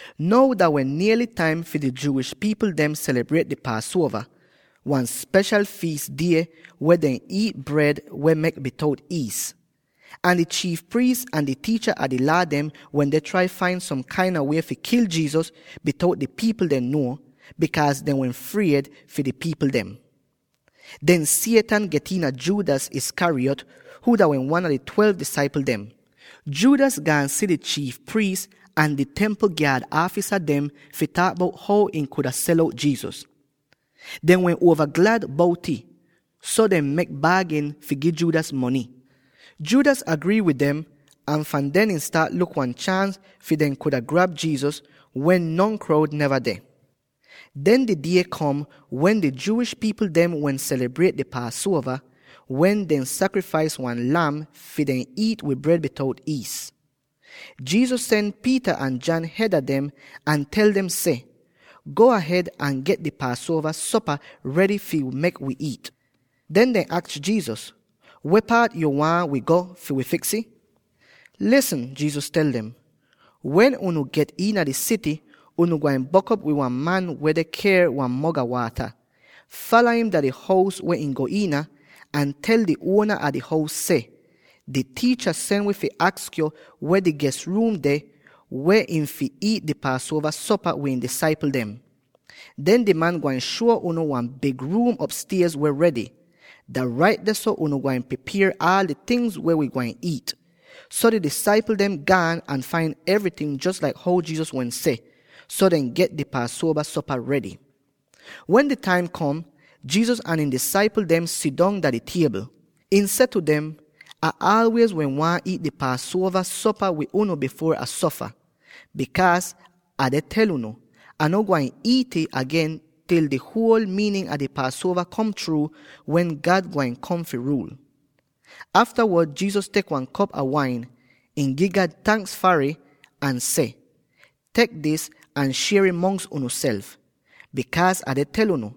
Now dah wehn niely taim fi di Jewish pipl dem selibriet di Paasuova —wan speshal fiis die wen dehn iit bred weh mek bitout iis. Ahn di chiif priis ahn di tiicha a di Laa dem wende trai fain som kain a wie fi kil Jesus, bitout di pipl dem nuo, bikaaz dehn wehn fried fi di pipl dem. Den Satan get iina Judas Iscariot —huu dah wehn wan a di twelve disaipl dem. Judas gaan si di chiif priis ahn di Templ gyaad aafisa dem fi taak bout how ihn kuda sel out Jesus. Dem wehn uova glad bout'ih, so dehn mek baagin fi gi Judas mony. Judas grii wid dem, ahn fahn den ihn staat luk wan chaans fi dehn kuda grab Jesus wen non kroud neva deh. Den di die kom wen di Jewish pipl dem wehn selibriet di Paasuova, wen dehn sakrifais wan lam fi dehn iit wid bred bitout iis. Jesus sen Peter ahn John hed a dem, ahn tel dem seh, “Go ahed ahn get di Paasuova sopa redy fi mek wi iit.” Den dehn aks Jesus, “Weh paat yo waahn wi go fi fiks ih?” “Lisn,” Jesus tel dem, “Wen unu get iina di sity, unu gwain bok'op wid wan man weh deh ker wan mog a waata. Fala im dah di hous weh ihn go iina, ahn tel di uona a di hous seh, ‘Di Tiicha sen wi fi aks yo weh di ges ruum deh, weh ihn fi iit di Paasuova sopa wid ihn disaipl dem.’ Den di man gwain shuo unu wan big ruum opstiez weh redy. Dah rait dehso unu gwain pripier aal di tingz weh wi gwain iit.” So di disaipl dem gaan, ahn fain evryting jos laik how Jesus wehn seh. So dehn get di Paasuova sopa redy. Wen di taim kom, Jesus ahn ihn apasl dem sidong dah di tiebl. Ihn seh tu dem, “Ah aalwiez wehn waahn iit dis Paasuova sopa wid unu bifuor Ah sofa. Bikaaz, Ah deh tel unu: Ah no gwain iit'ih agen til di huol miinin a di Paasuova kom chruu, wen God taim kom fi ruul.” Aftawod Jesus tek wan kop a wain, ihn gi God tanks far ih, ahn seh, “Tek dis ahn shier'ih mongs unuself. Bikaaz, Ah deh tel unu: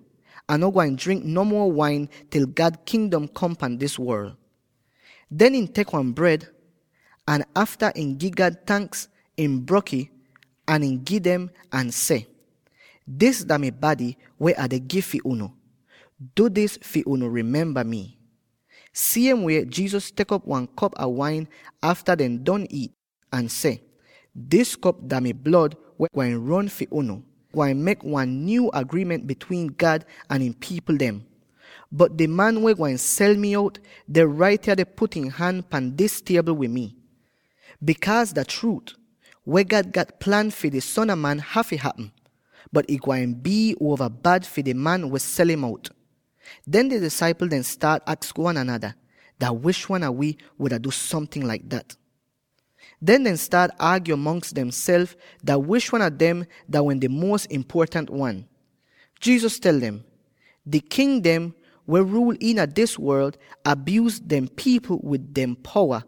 Ah no gwain drink no muo wain til God Kingdom kom pan dis worl.” Den ihn tek wan bred, ahn afta ihn gi God tanks, ihn brok'ih, ahn ihn gi dem ahn seh, “Dis dah mi bady weh Ah deh gi fi unu. Du dis fi unu rimemba mi.” Siem wie Jesus tek op wan kop a wain afta dehn don iit, ahn seh, “Dis kop dah mi blod weh gwain ron fi unu, ahn gwain mek wan nyuu agriiment bitwiin God ahn ihn pipl dem. “Bot di man weh gwain sel mi out, deh rait yah deh put ihn han pan dis tiebl wid mi. Bikaaz dah chruut, weh God gat plan fi di Son a Man hafy hapm; bot ih gwain bii uova bad fi di man weh sel'im out.” Den di disaipl dem staat aks wan anada, “Dah wish wan a wi wuda du somting laik dat?” Den dehn staat aagyo mongs dehnself dah wish wan a dem dah wehn di muos impuotant wan. Jesus tel dem, “Di king dem, weh ruul iina dis worl, abyuuz dehn pipl wid dehn powa,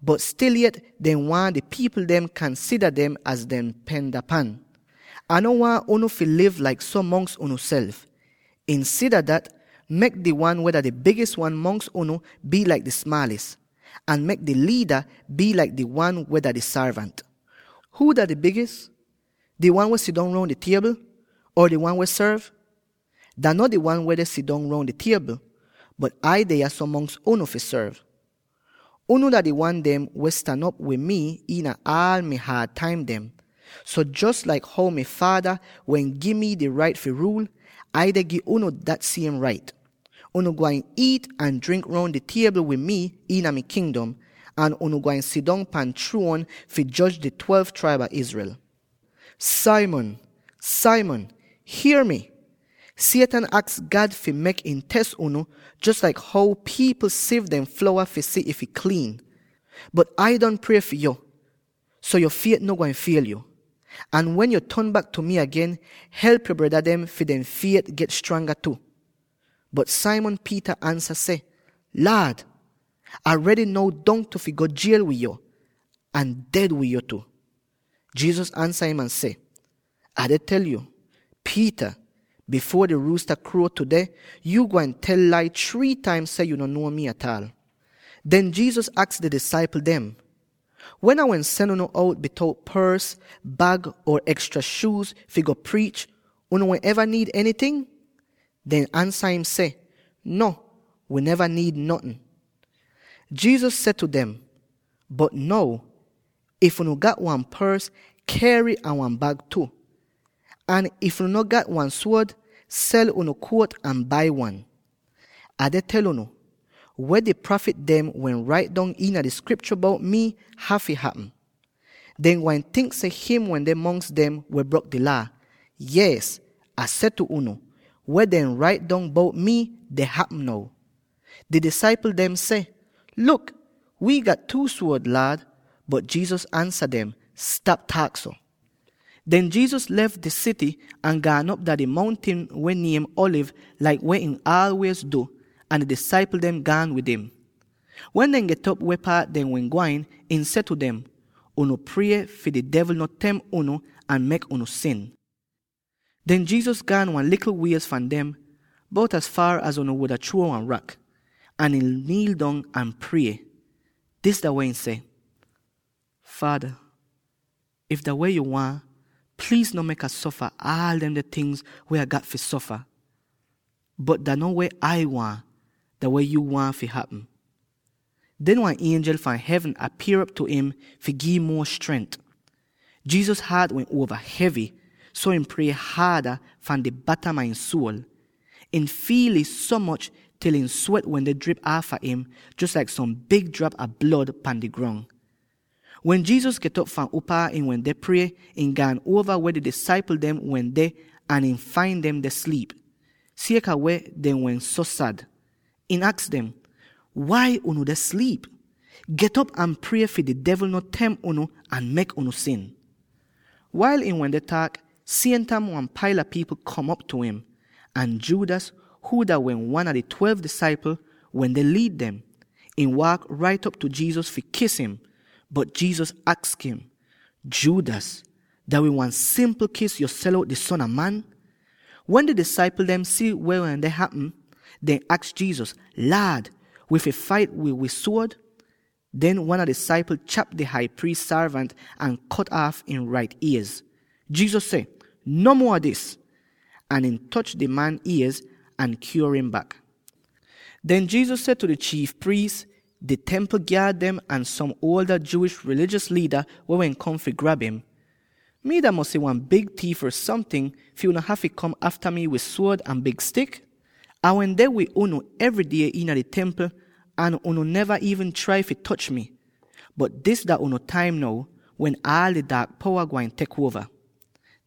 bot stil yet dehn waahn di pipl dem kansida dem az dehn pendapan. Ah no waahn unu fi liv laik so mongs unuself. Insida dat, mek di wan weh dah di bigis wan mongs unu bii laik di smaalis, ahn mek di liida bii laik di wan weh dah di sorvant. Huu dah di bigis? Di wan weh deh sidong roun di tiebl? Or di wan weh sorv? Dah no di wan weh deh sidong roun di tiebl? Bot Ai deh yahso mongs unu fi sorv. “Unu dah di wan dem weh stan op wid mi iina aal mi haad taim dem, so jos laik how mi Faada wehn gi mi di rait fi ruul, Ai deh gi unu dat siem rait. Unu gwain iit ahn drink roun di tiebl wid mii iina mi Kingdom, ahn unu gwain sidong pahn chruon fi joj di twelve traib a Israel. “Simon, Simon, hier mi! Satan aks God fi mek ihn tes unu, jos laik how pipl siv dehn flowa fi si if ih kliin. Bot Ai don prie fi yo, so yo fiet no gwain fiel yo. Ahn wen yo ton bak tu mi agen, help yo breda dem fi dehn fiet get stranga tu.” Bot Simon Peter ansa ahn seh, “Laad, Ah redy now dongtu fi go jiel wid yo; ahn ded wid yo tu!” Jesus ansa im ahn seh, “Ah deh tel yo, Peter, bifuor di ruusta kruo tudeh, yu gwain tel lai three taim seh yu no nuo mi ataal.” Den Jesus aks di disaipl dem, “Wen Ah wehn sen unu out bitout pors, bag, or ekstra shuuz fi go priich, unu wehn eva niid enyting?” Dehn ansa im seh, “No, wi neva niid notn.” Jesus seh tu dem, “Bot now, if unu gat wan pors, unu fi ker'ih ahn wan bag tu; ahn if unu no gat wan suod, sel unu jakit ahn bai wan. Ah deh tel unu: weh di prafit dem wehn rait dong iina di Skriptyo bout mii hafy hapm: ‘Dehn gwain tink seh him wende mongs dem weh brok di Laa.’ Yees, Ah seh tu unu, weh dehn rait dong bout mii, deh hapm now.” Di disaipl dem seh, “Luk, wi gat two suod, Laad.” Bot Jesus ansa dem seh, “Stap taak so!” Den Jesus lef di sity ahn gaan op dah di mountin weh niem Alivz laik weh ihn aalwiez du, ahn di disaipl dem gaan wid im. Wen dehn get weh paat dehn wehn gwain, ihn seh tu dem, “Unu prie fi di devl no temp unu ahn mek unu sin.” Den Jesus gaan wan likl wiez fahn dem —bout az faar az unu wuda chruo wan rak— ahn ihn niil dong ahn prie. Dis dah weh ihn seh: “Faada, if dah weh yo waahn, pliiz no mek Ah sofa aal demde tingz weh Ah gat fi sofa. Bot dah no weh Ai waahn; dah weh yuu waahn fi hapm.” [Den wan ienjel fahn hevn apier'op tu im fi gi'im muo strent. Jesus haat wehn uova hevy, so ihn prie haada fahn di batam a ihn suol. Ihn fiil ih so moch til ihn swet wende drip aafa im, jos laik som big drap a blod pan di grong.] Wen Jesus get'op fahn upaa ihn wende prie, ihn gaan uova tu weh di disaipl dem wehn deh ahn ihn fain dem deh sliip, sieka weh dehn wehn so sad. Ihn aks dem, “Wai unu deh sliip? Get'op ahn prie fi di devl no temp unu ahn mek unu sin.” Wail ihn wende taak, siem taim wan paila pipl kom op tu im. Ahn Judas —huu dah wehn wan a di twelve disaipl— wende liid dem. Ihn waak rait op tu Jesus fi kis im, bot Jesus aks im, “Judas, dah wid wan simpl kis yo sel out di Son a Man?” Wen di disaipl dem si weh wende hapm, dehn aks Jesus, “Laad, wi fi fait wid wi suod?” Den, wan a di disaipl chap di Hai Priis sorvant ahn kot aaf ihn rait iez! Jesus seh, “No muo a dis!” Ahn ihn toch di man iez ahn kyuor im bak. Den Jesus seh tu di chiif priis, di Templ gyaad dem, ahn som a di Jewish rilijos liida weh wehn kom fi grab im, “Mii dah mosy wan big tiif or somting, fi unu hafy kom afta mi wid suod ahn big stik? Ah wehn deh wid unu evry die iina di Templ ahn unu neva iivn trai fi toch mi, bot dis dah unu taim now, wen aal di daak powa gwain tek uova.”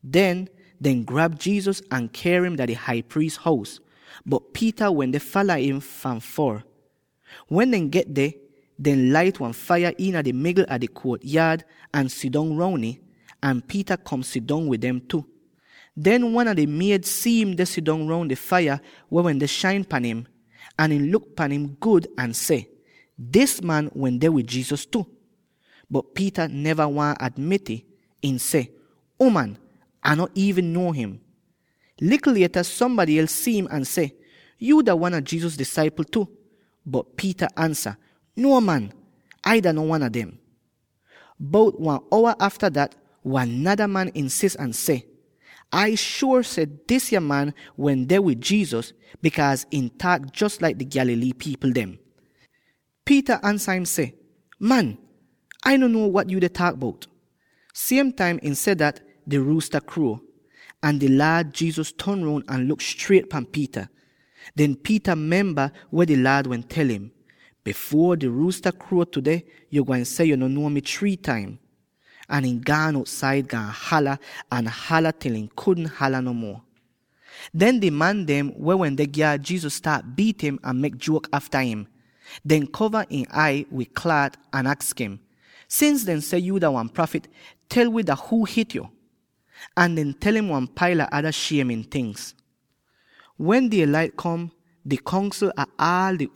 Den, dehn grab Jesus ahn ker im dah di Hai Priis hous, bot Peter wende fala im fahn foor. Wen dehn get deh, dehn lait wan faiya iina di migl a di kuot-yaad ahn sidong roun ih, ahn Peter kom sidong wid dem tu. Den wan a di sorvant gyal si'im deh sidong roun di faiya weh wende shain pahn im; ahn ihn luk pahn im gud ahn seh, “Dis man wende wid Jesus tu!” Bot Peter neva waahn admit'ih. Ihn seh, “Uman, Ah no iivn nuo him.” Likl lieta, sombady els si'im ahn seh, “Yuu dah wan a Jesus disaipl tu.” Bot Peter ansa, “Nuo man! Ai dah no wan a dem.” Bout wan owa afta dat, wan nada man insis ahn seh, “Ai shuor seh disya man wende wid Jesus, bikaaz ihn taak jos laik di Galilee pipl dem.” Peter ansa im seh, “Man, Ai no nuo wat yu deh taak bout!” Siem taim ihn seh dat, di ruusta kruo. Ahn di Laad Jesus ton roun ahn luk striet pan Peter. Den Peter memba weh di Laad wehn tel im: “Bifuor di ruusta kruo tudeh, yo gwain seh yo no nuo mi three taim.” Ahn ihn gaan outsaid, gaan hala ahn hala til ihn kudn hala no muo. Den di man dem weh wende gyaad Jesus staat biit im ahn mek juok aafa im. Dehn kova ihn ai wid klaat ahn aks im, “Sins dehn seh yuu dah wan prafit, tel wi dah huu hit yo?” Ahn dehn tel im wan paila ada shiemin tingz. Wen die-lait kom, di Kongsl ah aal di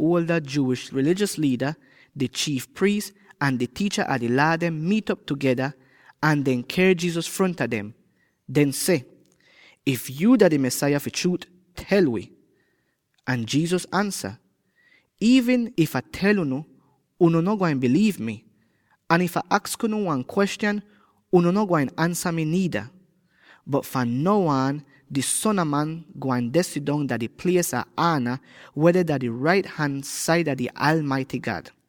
Jewish rilijos liida, di chiif priis, ahn di tiicha a di Laa dem miit'op tugeda, ahn dehn ker Jesus fronta dem. Dehn seh, “If yuu dah di Mesaya fi chruut, tel wi!” Ahn Jesus ansa, “Iivn if Ah tel unu, unu no gwain biliiv mi, ahn if Ah aks unu wan kwestyan, unu no gwain ansa mi niida. Bot fahn now aan di Son a Man gwain deh sidong dah di plies a ana, weh deh dah di rait han saida di Aalmaity God.”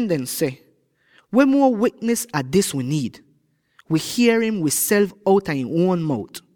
Den dehn seh, “Weh muo wiknis an dis wi niid? Wi hier im wiself outa ihn uon mout!”